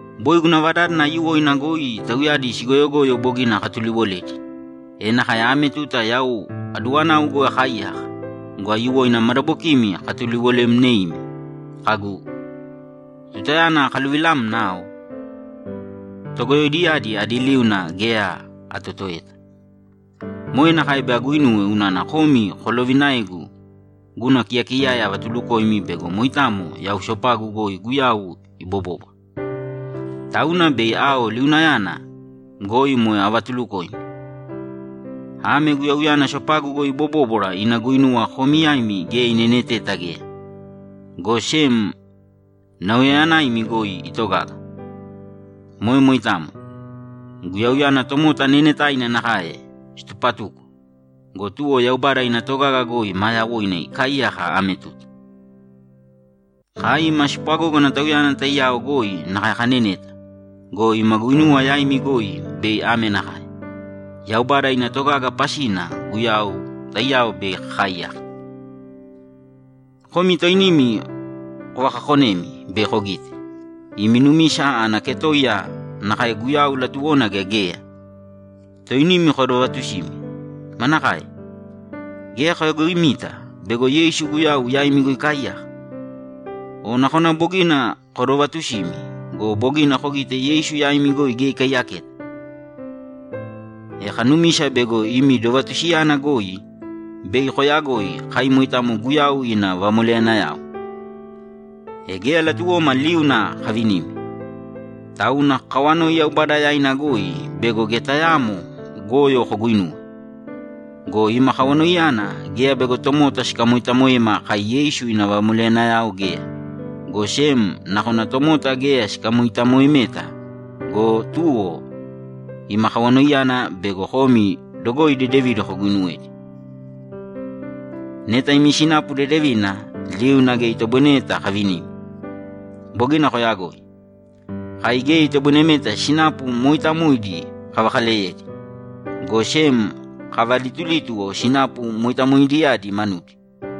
Boi guna vadádana aiyuwoina goi tauyadi sigoyogoyo bogina akatuliwoledi, e nakae ame tuta yau aduwanau goi akaaiyaka go, aiyuwoina madabokimi akatuliwolemneimi kagu, ‘Tutayana akaluvilamna ao, togoyoidiyadi adi liuna geya atotoeta.’ Moe nakae bei aguinuwe unana komi kolovinaegu guna kiyakiyaya avatulukoimi bego moitamo yau sopagu goi Guyau ibobóbwara. Tauna bei ao liunayana goi moe avatulukoimi. Ame Guyauyana sopagu goi ibobóbwara ina guinuwa komi yaimi geya ineneteta geya, go sem nauyayanaimi goi itogaga. Moe moitamo. Guyauyana tomota neenetaina nakae situpatuko go, tuwo Yaubada ina togaga goi maa yawoina ikaaiyaka ame tuta. Kai ima spwagógana Tauyana taiyao goi nakae kaneneta go, ima guinuwa yaimi goi bei ame nakae: Yaubada ina togaga pasina Guyau taiyao bei kakaaiyaka. Komi toinimi kovakakonēmi bei kogite, imi numisa ana ketoiya nakae Guyau latuwona gea geya? Toinimi kodovatusīmi. Manakae? Geya koyagoimita bego Yeisu Guyau yaimi goi ikaaiyaka? O nakona bogina kodovatusimi go, bogina kogite Yeisu yaimi goi geya ikaiyaketa! E kanumisa bego imi dovatusiyana goi bei koyagoi kai moitamo Guyau ina vamoleyanayao. E geya latuwoma liuna kavinimi, tauna kakawanoi Yaubada yaina goi bego geya tayaamo goyo koguuinuwe. Go ima kawanoiyana geya bego tomota sikamoitamoema kai Yeisu ina vamoleyanayao geya, go sem nakona tomota geya sikamoitamoemeta go, tuwo ima kawanoiyana bego komi dogoi dedevidi koguinuwedi. Neta imi sinapu dedevina, liuna geya itoboinemeta kavinimi. Bogina koyagoi. Kai geya itoboinemeta sinapu mooitamoidi kavakaleyedi, go sem kavalitulítuwo sinapu moitamoidiyadi manudi.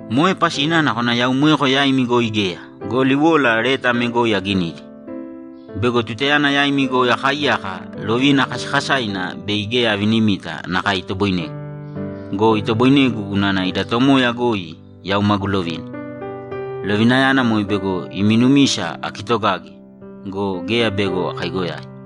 Moe pasina nakona yau moeko yaimi goi geya go, liwola leta ame goi aginidi: Bego tutayana yaimi goi akaaiyaka lovina kasakasaina bei geya avinimita nakae itoboinegu. Go itoboinegu unana ida Tomoya goi yau magu lovina. Lovinayana moe bego imi numisa akitogage go, geya bego akaigoyai.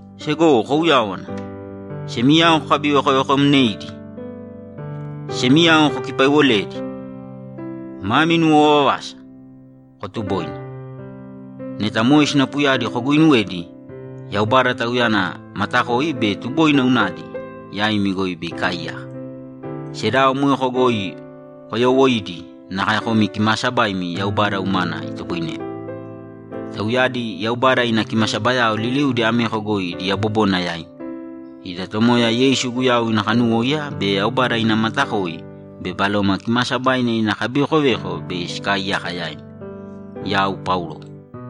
Segowo, kouyāwana! Semiyao kokabivekovekomnēidi. Semiyao kokipaiwolēdi. Mami nuwovavasa. Kotubōina. Neta moe sinapuyadi koguuinuwedi, Yaubada, Tauyana matakoi be tuboina unadi, yaimi goi bei ikaaiyaka. Sedao moeko goi koyoowoiīdi nakae komi kimaasabaimi Yaubada umana itoboinemi. Tauyadi Yaubada ina kimasabayao liliudi ameko goi idi yabobona yaimi. Ida Tomoya Yeisu Guyau ina kanuwóiya be Yaubada ina matakoi be Baloma Kimaasabaina ina kabivekoveko bei sikaaiyaka yaimi. Yau Paulo